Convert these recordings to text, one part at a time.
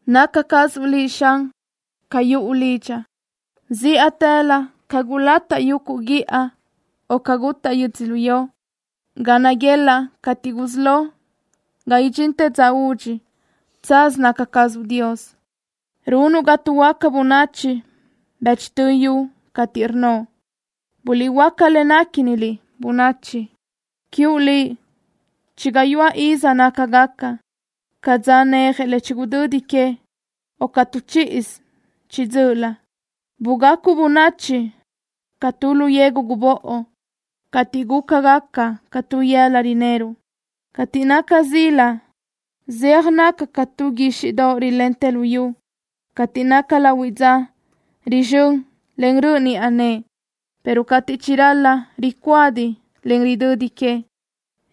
Naca cazuʼ Liʼ, Xan, ca yuʼu lidxaʼ. Zíʼatëlö ca gulataʼ yuguʼ guíʼa, o ca gutaʼ yödzölió, ga naguelaʼ cateʼ gusí lo ga idxintë dza udxi, tsaz naca cazuʼ Dios. Runuʼ ga tuʼhuöáca bönachi bëchtö yu cateʼ rnnoʼ: “Guliʼhuöáca le néquiniliʼ, bönachi.” Quiuʼ Liʼ chi gayuáʼ iz nácagaca ca dza neje le chigudödi que, o ca tu chíʼisö chiʼi dzö́ʼölö. Bugacuʼ bönachi ca tu lu yegu gubóʼo, ateʼ gúcagaca ca tu yëla rineruʼ. Cateʼ naca zila zéaj naca ca tu guíxiʼdoʼ rilentë luyú. Cateʼ naca lahuiʼ dza rizxö́n, en röʼ niʼa nëʼe, pero cateʼ chiral-la, ricuadiʼ, en ridödi que.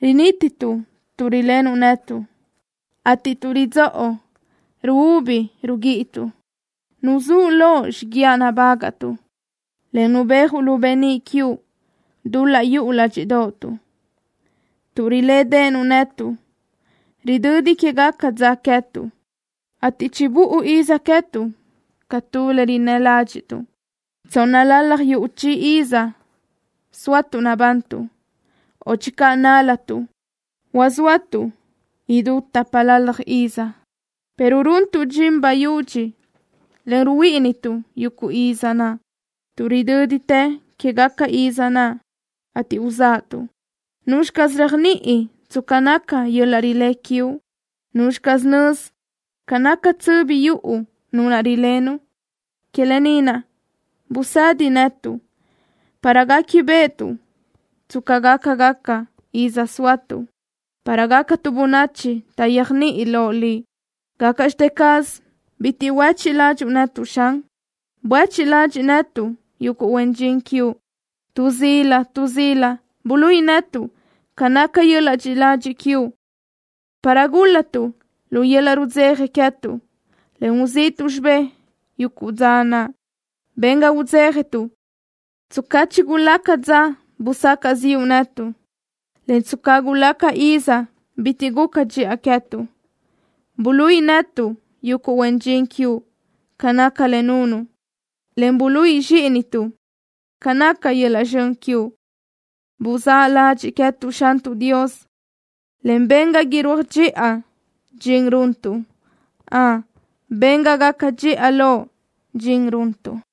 Rinítituʼ tuʼ rilenuʼ netuʼ, ateʼ tuʼ ridzóʼo ruúbi ruguíʼituʼ. Nuzúʼ loʼ xiguiaʼ nabágaʼtuʼ, en nubéajuʼ lu beníʼ quiuʼ dul-laʼ yuʼu ládxiʼdoʼotuʼ. Tuʼ rilédeʼenuʼ netuʼ ridödi quégaca dza queë́tuʼ, ateʼ chibúʼu iz queë́tuʼ ca tu le rinnë́ ládxiʼtuʼ. Tsónnalalaj yuʼ chi ízisö zóatuʼ nabantuʼ, o channö nál-latuʼ, huazóatuʼ idú tápalalaj iz, pero runtuʼ dxin bayudxi, en ruhuíʼinituʼ yuguʼ iz naʼ, tuʼ ridö́ditë quéguequi iz naʼ, ateʼ uzáʼatuʼ. ¿Nuzxi caz réajniʼi tsca naca yöl-laʼ rilé quiuʼ? ¿Nuzxi caz nözi ca naca tsöbi yuʼu nu naʼ rilenuʼ? Que lë ni naʼ busëdi netuʼ para guéquibeʼetuʼ tsca gácagaca iz zóatuʼ, para gácatuʼ bönachi taʼyéajniʼi loʼ Liʼ. ¿Gácaʼxte caz bitiʼ huéchiʼ ládxuʼu netuʼ, Xan? Buéchiʼ ladxiʼ netuʼ, yuguʼ huen dxin quiuʼ. Tu zila tu zila buluíʼi netuʼ ca naca yöl-laʼ dxiʼi ladxiʼ quiuʼ, para gúl-latuʼ lu yöl-laʼ rudzeja queë́tuʼ, en uzíʼituʼ xibé yuguʼ dza naʼ. Ben ga udzéjatuʼ tsca chigulaca dza busacaʼ ziʼu netuʼ, en tsca gulaca iz bitiʼ guca dxiʼa queë́tuʼ. Buluíʼi netuʼ, yuguʼ huen dxin quiuʼ, ca naca le nunuʼ, en buluíʼi zxíʼinituʼ ca naca yöl-laʼ zxön quiuʼ. ¡Buzáʼ ladxiʼ queë́tuʼ, Xantuʼ Dios, en ben ga irúaj dxiʼa dxin runtuʼ! ¡Ön, ben ga gaca dxiʼa loʼ dxin runtuʼ!